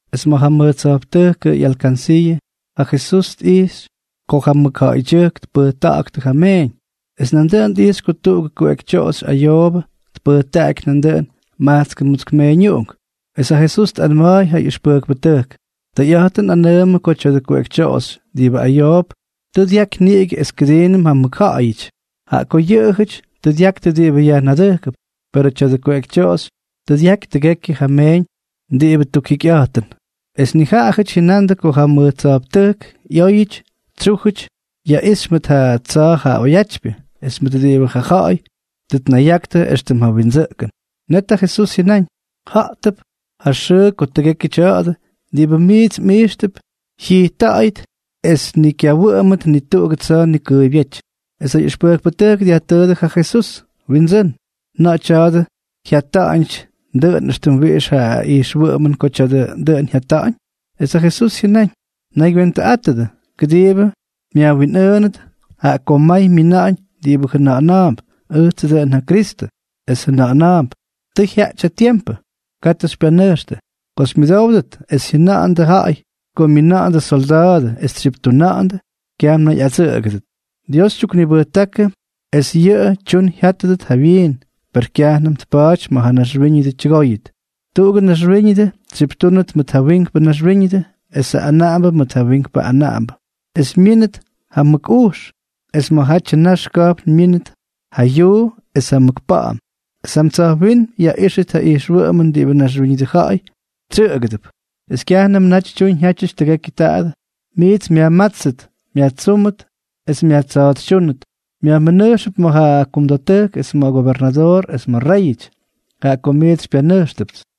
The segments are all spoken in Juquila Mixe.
Es ma̱ ja mʉj tsa̱jptʉjkʉ ꞌyalkansiiʉ ja Jesús tꞌijxy ko ja mʉkja̱ꞌa̱ydyʉjk tpʉjta̱ꞌa̱ktʉ ja meeñ. Es nandʉꞌʉn tꞌijxy ko tuꞌugʉ kuꞌekytyoꞌoxy ayoobʉ tpʉjtaꞌaky nandʉꞌʉn majtskʉ mutsk meeñuꞌunk. Es ja Jesús tꞌanma̱a̱y ja ꞌyʉxpʉjkpʉtʉjk: —Tʉyꞌa̱jtʉn nꞌanʉʉmʉ ko tya̱dʉ kuꞌekytyoꞌoxy diꞌibʉ ayoop tʉ dyaky niꞌigʉ es kʉdiinʉm ja mʉkja̱ꞌa̱yʉty, jaꞌa ko yʉꞌʉjʉty tʉ dyaktʉ diꞌibʉ yajnadʉjkʉp, perʉ tya̱dʉ kuꞌekytyoꞌoxy tʉ dyaky tʉgekyʉ ja myeeñ diꞌibʉ tukjikyꞌa̱jtʉn. Es nijaꞌajʉty jyʉna̱ꞌa̱ndʉ ko ja mʉj tsa̱jptʉjk ꞌyóyʉty tsyújʉty yaꞌixy mʉt ja tsa̱a̱ ja oyatypyʉ es mʉt diꞌibʉ ja ja̱ꞌa̱y tʉ tnayaktʉ éxtʉm ja windsʉꞌkʉn. Net ja Jesús jyʉnáñ: —Ja̱ꞌtʉp ja xʉʉ ko tʉgekyʉ tya̱a̱dʉ diꞌibʉ miits mꞌijxtʉp jyijtta̱ꞌa̱yʉt es ni kyawʉꞌʉmʉt ni tuꞌugʉ tsa̱a̱ nikʉʉybyéty. Es ja ꞌyʉxpʉjkpʉtʉjk dyajtʉʉdʉ ja Jesús: —Windsʉ́n, ¿na̱ꞌa̱ tya̱a̱dʉ jyata̱ꞌa̱ñ dʉꞌʉn es wiꞌix ja ijxwʉꞌʉmʉn ko tya̱a̱dʉ dʉꞌʉn jyata̱ꞌa̱ñ? Es ja Jesús jyʉnáñ: —Naygywentʉꞌátʉdʉ, kʉdiibʉ myajwinꞌʉʉndʉt, jaꞌa ko may myina̱ꞌa̱ñ diꞌibʉ jʉna̱ꞌa̱na̱a̱mp: “Ʉjtsʉ dʉꞌʉn ja Kristʉ.” Es jʉna̱ꞌa̱na̱a̱mp: “Tʉ jyaꞌty ja tiempʉ.” Katʉ xypyanʉjxtʉ. Ko xymyʉdówdʉt es jyʉna̱ꞌa̱ndʉ ja̱ꞌa̱y ko myina̱ꞌa̱ndʉ solda̱a̱dʉ es tsyiptuna̱ꞌa̱ndʉ, kyaj mnayꞌadsʉꞌʉgʉdʉt. Dios tyuknibʉjtákʉ es yʉꞌʉ tyun jyátʉt jawyiin, per kyajnʉm tpa̱a̱ty ma̱ ja naxwíñʉdʉ tyʉgóyʉt. ’Tuꞌugʉ naxwíñʉdʉ tsyiptúnʉt mʉt ja wiinkpʉ naxwíñʉdʉ esʉ anaꞌambʉ mʉt ja wiink anaꞌambʉ. Es myínʉt ja mʉk ujx, es ma̱jatyʉ nax ka̱jpn myínʉt ja yuu es ja mʉk pa̱ꞌa̱m, es jam tsa̱jwínm yaꞌíxʉt ja ijxwʉꞌʉmʉn diꞌibʉ naxwíñʉdʉ ja̱ꞌa̱y tsyʉꞌʉgʉdʉp. ’Es kyajnʉmʉ naty tyuñ jyaꞌtyʉty tʉgekyʉ taadʉ, miits myajmátstʉt, myajtsúmʉt es myajtsa̱a̱tsytyúnʉt, myajmʉnʉjxʉp ma̱ ja kumda̱ttʉjk es ma̱ gobernadoor es ma̱ réyʉty, jaꞌa ko miits xypyanʉjxtʉpts.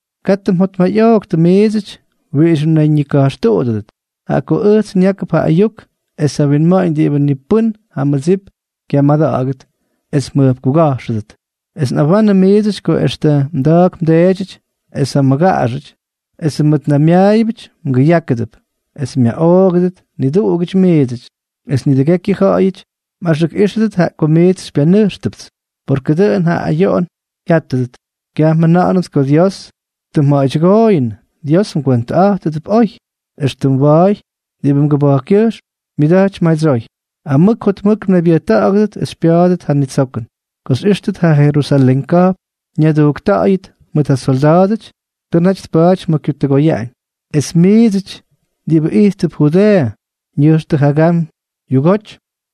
Katʉ mjotmayꞌooktʉ miidsʉty wiꞌix mnayñika̱jxtuꞌudʉdʉt, jaꞌa ko ʉjts nyákʉp ja ayuk es ja winma̱ꞌa̱ñ diꞌibʉ ni pʉ́n ja mmʉdsip kyamada̱ꞌa̱gʉt es mjʉjpkuga̱jxʉdʉt. Es nꞌawanʉ miidsʉty ko extʉ mda̱a̱k mdeedyʉty es ja mmʉgaꞌaxʉty es yʉ mmʉtnaymyaayʉbʉty mgʉyákʉdʉp, es myaꞌoogʉdʉt niduꞌugʉty miidsʉty. Es nidʉgekyʉ ja̱ꞌa̱yʉty mꞌaxʉkꞌíxʉdʉt jaꞌa ko miits xypyanʉjxtʉpts. Per ko dʉꞌʉn ja ayoꞌon jya̱ꞌtʉt, kyaj mjʉna̱ꞌa̱nʉt ko Dios tʉ mja̱ꞌa̱ydyʉgooyʉnʉ. Dios mgwentʉꞌa̱jtʉdʉp oy, extʉ mwa̱a̱y diꞌibʉ mgʉba̱jkkʉjxm myʉda̱jtypy madsyoy. Amʉk jotmʉk mnaybyʉjta̱ꞌa̱gʉdʉt es xypya̱a̱dʉt ja nitsokʉn. ’Ko xyꞌíxtʉt ja Jerusalén ka̱jpn ñadujkta̱ꞌa̱yʉt mʉt ja solda̱a̱dʉty, tʉ naty tpa̱a̱ty ma̱ kyutʉgoyaꞌañ. Es miidsʉty diꞌibʉ ijttʉp Judeeʉ, nʉjxtʉ jagam yugoty;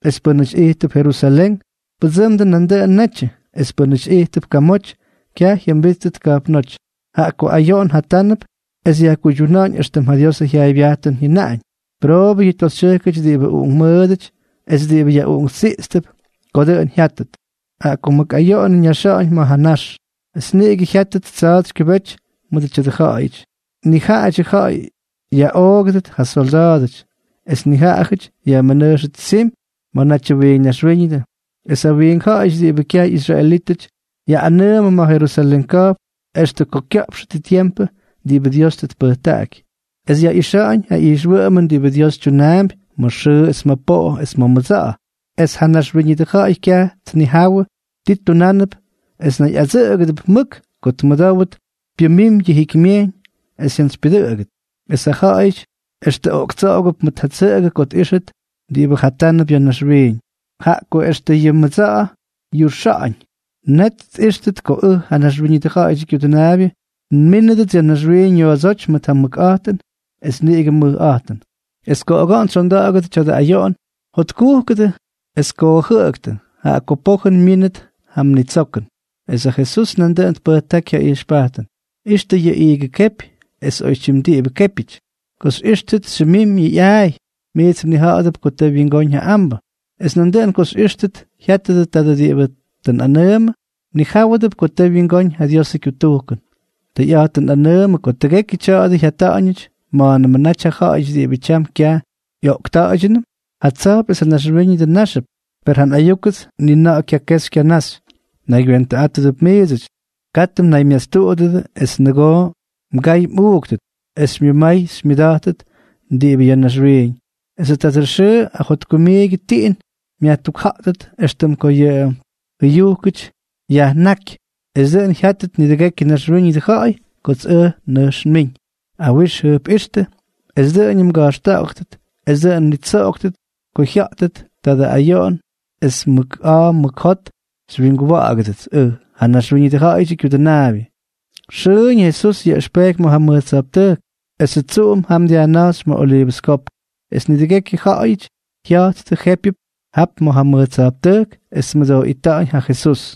es pʉ́nʉty ijttʉp Jerusalén, pʉdsʉmdʉ nandʉꞌʉn netyʉ, es pʉ́nʉty ijttʉp kamoty, kyaj jyʉmbíttʉt ka̱jpnóty, jaꞌa ko ayoꞌon jatánʉp es yajkuydyuna̱ꞌa̱ñ éxtʉm ja Diosʉ jyaaybyajtʉn jyʉnaꞌañ. Pʉroobʉ yʉ toxytyʉjkʉty diꞌibʉ uꞌunkmʉʉdʉty es diꞌibʉ yaꞌuꞌunktsiꞌtsp ko dʉꞌʉn jyátʉt, jaꞌa ko mʉk ayoꞌon ñáxʉt ma̱ ja nax, y niꞌigʉ jyáttʉt tsa̱a̱tsy kyʉbety ma̱ tya̱dʉ ja̱ꞌa̱yʉty. Nijaꞌadyʉ ja̱ꞌa̱y yaꞌoogʉdʉt ja solda̱a̱dʉty. Es nijaꞌajʉty yajmʉnʉjxʉt tsimy ma̱jatyʉ wiink naxwíñʉdʉ. Es ja wiink ja̱ꞌa̱yʉty diꞌibʉ kyaj ꞌyisraelítʉty ꞌyanaꞌamʉ ma̱ ja Jerusalén ka̱jpn extʉ ko kya̱ꞌpxʉt ja tiempʉ diꞌibʉ Dios tʉ tpʉjtaꞌaky. ’Es yaꞌixa̱ꞌa̱ñ ja ijxwʉꞌʉmʉn diꞌibʉ Dios tyunaampy ma̱ xʉʉ es ma̱ poꞌo es ma̱ mʉdsa̱ꞌa̱. Es ja naxwíñʉdʉ ja̱ꞌa̱y kyaj tnijáwʉdʉ ti tunánʉp es nayꞌadsʉꞌʉgʉdʉp mʉk ko tmʉdówʉt pyʉmimy yʉ jikymyejyñ es jyantsypyʉdʉꞌʉgʉt. Es ja ja̱ꞌa̱yʉty extʉ oꞌktsoꞌogʉp mʉt ja tsʉꞌʉgʉ ko tꞌíxʉt diꞌibʉ jatánʉp ya̱ naxwiiñ, jaꞌa ko extʉ yʉ mʉdsa̱ꞌa̱ yuꞌxa̱ꞌa̱ñ. Net tꞌíxtʉt ko ʉj, ja Naxwíñʉdʉ Ja̱ꞌa̱yʉdyʉ Kyudʉnaabyʉ, nmínʉdʉts ya̱ naxwiiñ yoodsóty mʉt ja mʉkꞌa̱jtʉn es niꞌigʉ mʉjꞌa̱jtʉn. Es ko oga̱ꞌa̱n tsyonda̱ꞌa̱gʉt tya̱dʉ ayoꞌon, jotkujkʉdʉ es koojʉꞌʉktʉ, jaꞌa ko pojʉn myínʉt ja mnitsokʉn. Es ja Jesús nandʉꞌʉn tpʉjtáky ja ijxpajtʉn: —Ixtʉ yʉ iigʉ kepy es oytyim diꞌibʉ képyʉty. Ko xyꞌíxtʉt xyʉmimy yʉ ꞌyaay, miits mnija̱ꞌa̱dʉp ko tʉ wyingóñ ja ambʉ. Es nandʉꞌʉn ko xyꞌíxtʉt jyátʉdʉ tadʉ diꞌibʉ tʉ nꞌanʉʉmʉ, mnijáwʉdʉp ko tʉ wyingóñ ja Diosʉ kyutujkʉn. ’Tʉyꞌa̱jtʉn nꞌanʉʉmʉdʉ ko tʉgekyʉ tya̱a̱dʉ jyata̱ꞌa̱ñʉty ma̱a̱nʉmʉ naty ja ja̱ꞌa̱yʉty diꞌibʉ tyam kyaj ꞌyoꞌkta̱ꞌa̱ydyʉnʉm. Ja tsa̱jp es ja naxwíñʉdʉ náxʉp, per ja nꞌayúkʉts ni na̱ꞌa̱ kyakexy kyanaxy. ’Mnaygywentʉꞌátʉdʉp miidsʉty. Katʉ mnaymastuꞌudʉdʉ es nʉgoo mgay mmʉꞌuuktʉt es xymyʉmay xymyʉda̱jtʉt diꞌibʉ ya̱ naxwiiñ, esʉ tadʉ xʉʉ ajotkumiigyʉ tiꞌin myajtukja̱ꞌttʉt éxtʉm ko ja jʉyujkʉty yajnáky. Es dʉꞌʉn jyáttʉt nidʉgekyʉ naxwíñʉdʉ ja̱ꞌa̱y kots ʉj nʉjx nmiñ. Awix jʉjpꞌíxtʉ es dʉꞌʉñʉm mga̱jxta̱ꞌa̱ktʉt es dʉꞌʉn mnitsoꞌoktʉt ko jyátʉt tadʉ ayoꞌon es mʉk a̱a̱ mʉk jot xywyinguwa̱ꞌa̱gʉdʉts, ʉj, ja Naxwíñʉdʉ Ja̱ꞌa̱yʉdyʉ Kyudʉnaabyʉ. Xʉʉñ ja Jesús yaꞌʉxpeky ma̱ ja mʉj tsa̱jptʉjk, esʉ tsuꞌum jam dyajnáxy ma̱ Oliivʉs Kopk. Es nidʉgekyʉ ja̱ꞌa̱yʉty jya̱jttʉ jépyʉp jap ma̱ ja mʉj tsa̱jptʉjk es tmʉdooꞌita̱ꞌa̱ñ ja Jesús.